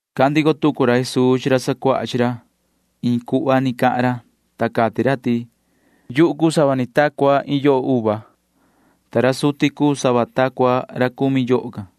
[Cahan ndico tucu ra Jesuu chi ra sacuaha chi ra. Iin cuhva cahan ra, ta cati ra ti:] ’Yuhu cuu sava ni ta cua iin yoho, ta ra suti cuu sava ta cua ra cumi yoho can.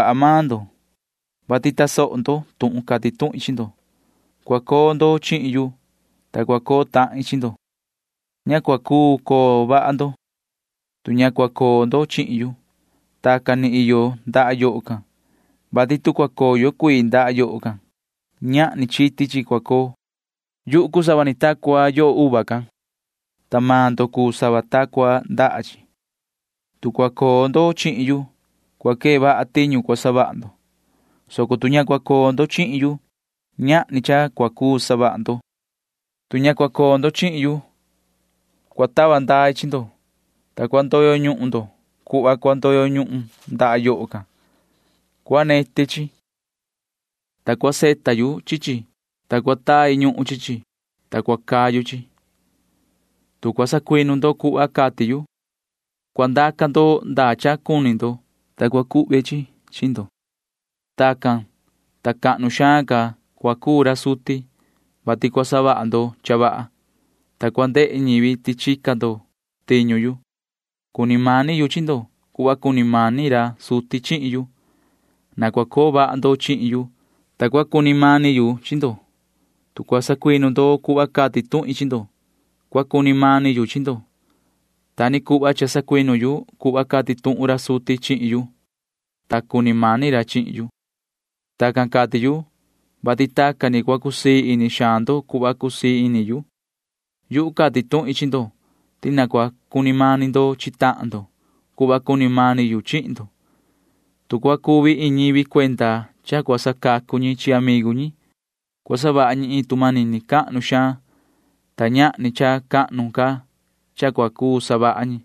Cha iyo vaha maan ndo, vati tasoho ndo tuhun cati tuhin chi ndo. Cua coo ndo chihin yu, ta cua coo tahin chi ndo. Ña cua cuu coo vaha ndo, tu ña cua coo ndo chihin yu. Tacan ni iyo ndaha yoho can, vati tu cua coyo cuii ndaha yoho can, ñahni chiti chi cua coo. ’Yuhu cuu sava ni ta cua yoho can, ta maan ndo cuu sava ta cua ndaha chi. Tu cua coo ndo chihin yu, cua quee vaha tiñu cua savaha ndo, soco tu ña cua coo ndo chihin yu, ñahni cha cua cuu savaha ndo. Tu ña cua coo ndo chihin yu, cua tava ndai chi ndo, ta cua ndoyo ñuhun ndo cuhva cua ndoyo ñuhun ndaha yoho can. Cua neti chi, ta cua savita yu chi chi, ta cua tai ñuhun chi chi, ta cua cayu chi. ’Tu cua sacuinu ndo cuhva cati yu, cua ndaca ndo ñaan cha cuni ndo, ta cua cuhve chi chi chi ndo. Tacan, ta cahnu xaan ca cua cuu ra suti, vati cua savaha ndo cha vaha, ta cua ndehe ñivi ti chica ndo tiñu yu. Cuni mani yu chi ndo cuhva cuni mani ra suti chihin yu. Na cua coo vaha ndo chihin yu, ta cua cuni mani yu chi ndo. Tu cua sacuinu ndo cuhva cati tuhin chi ndo, cua cuni mani yu chi ndo. Ta ni cuhva cha ni sacuinu yu cuhva cati tuhun ra suti chihin yu, ta cuni mani ra chihin yu. ’Tacan cati yu, vati tacan ni cua cusii ini xaan ndo cuhva cusii ini yu. Yuhu cati tuhin chi ndo ti na cua cuni mani ndo chi tahan ndo cuhva cuni mani yu chihin ndo. Tu cua cuvi iin ñivi cuenda cha cua sacacu ñi chi amigu ñi, cua savaha ñi iin tu manini cahnu xaan, ta ñahni cha cahnu ca cha cua cuu savaha ñi.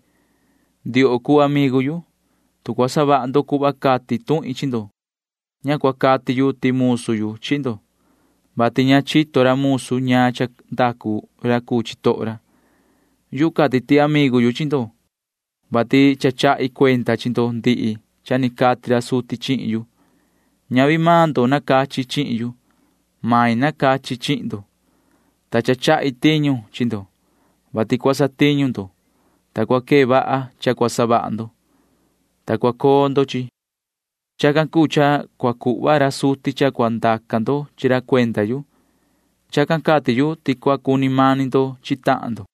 Ndioho cuu amigu yu, tu cua savaha ndo cuhva cati tuhin chi ndo. Ña cua cati yu ti musu yu chi ndo, vati ña chito ra musu ñaan cha ndacu ra cuu chitoho ra. Yu cati ti amigu yu chi ndo, vati cha chahi cuenda chi ndo ndihi cha ni cati ra suti chihin yu. Ñavi maan ndo nacachi chihin yu, soco yuhu nacachi chi maan ndo, ta cha chahi tiñu chi ndo, vati cua satiñu ndo, ta cua quee vaha cha cua savaha ndo, ta cua ndoo chi. Chacan cuu cha cua cuhva ra suti ñaan cha cua ndaca ndo chi ra cuenda yu. Chacan cati yu ti cua cuni mani ndo chi tahan ndo.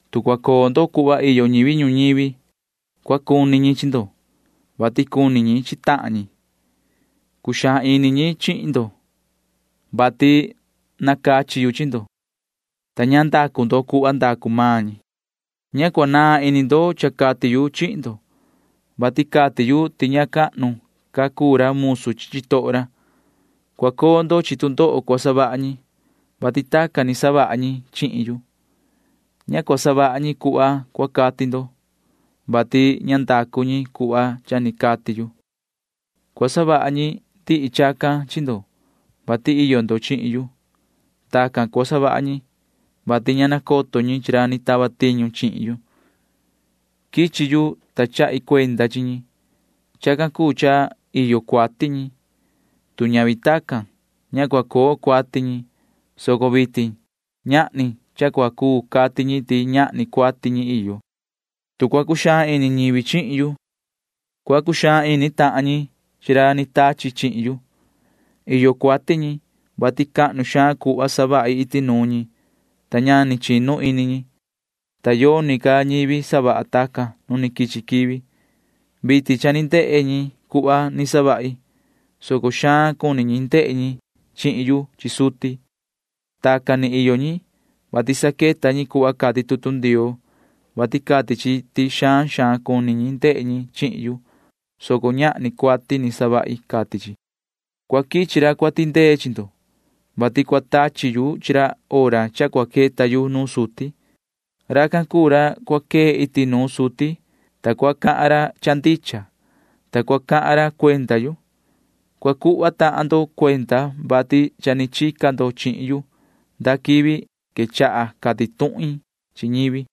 Tu cua coo ndo cuhva iyo ñivi ñuñivi, cua cuni ñi chi ndo, vati cuni ñi chi tahan ñi. Cuxaan ini ñi chihin ndo, vati nacachi yu chi ndo, ta ña ndacu ndo cuhva ndacu maan ñi. Ña cua naan ini ndo cha cati yu chihin ndo, vati cati yu ti ña cahnu ca cuu ra musu chi chitoho ra. Cua coo ndo chi tu ndoho cua savaha ñi, vati tacan ni cha ni savaha ñi chihin yu. Ña cua savaha ñi cuhva cua cati ndo, vati ña ndacu ñi cuhva cha ni cati yu. Cua savaha ñi ndihi chacan chi ndo, vati iyo ndo chihin yu. Tacan cua savaha ñi, vati ña nacoto ñi chi ra ni tava tiñu chihin yu. ’Quichi yu, ta chahi cuenda chi ñi. Chacan cuu cha iyo cuati ñi. Tu ñavi tacan, ña cua coo cuati ñi, soco vitin ñahni cha cua cuu cati ñi ti ñahni cuati ñi iyo. Tu cua cuxaan ini ñivi chihin yu, cua cuxaan ini tahan ñi chi ra ni tachi chihin yu. Iyo cuati ñi, vati cahnu xaan cuhva savahi iti nuun ñi, ta ña ni chinu ini ñi, ta yoni ca ñivi savaha tacan nu ni quichi quivi. Vitin cha ni ndehe ñi cuhva ni savahi, soco xaan cuni ñi ndehe ñi chihin yu chi suti. Tacan ni iyo ñi, vati saqueta ñi cuhva cati tutu Ndioo, vati cati chi ti xaan xaan cuni ñi ndehe ñi chihin yu, soco ñahni cuati ni savahi, cati chi. ’Cua quichi ra cua tindee chi ndo, vati cua tachi yu chi ra hora cha cua queta yu nuun suti. Racan cuu ra cua quee iti nuun ra suti, ta cua cahan tahan ra cha ndicha, ta cua cahan ra cuenda yu. Cua cuhva tahan ndo cuenda, vati cha ni chica ndo chihin yu nda quivi quechaha cati tuhin chi ñivi.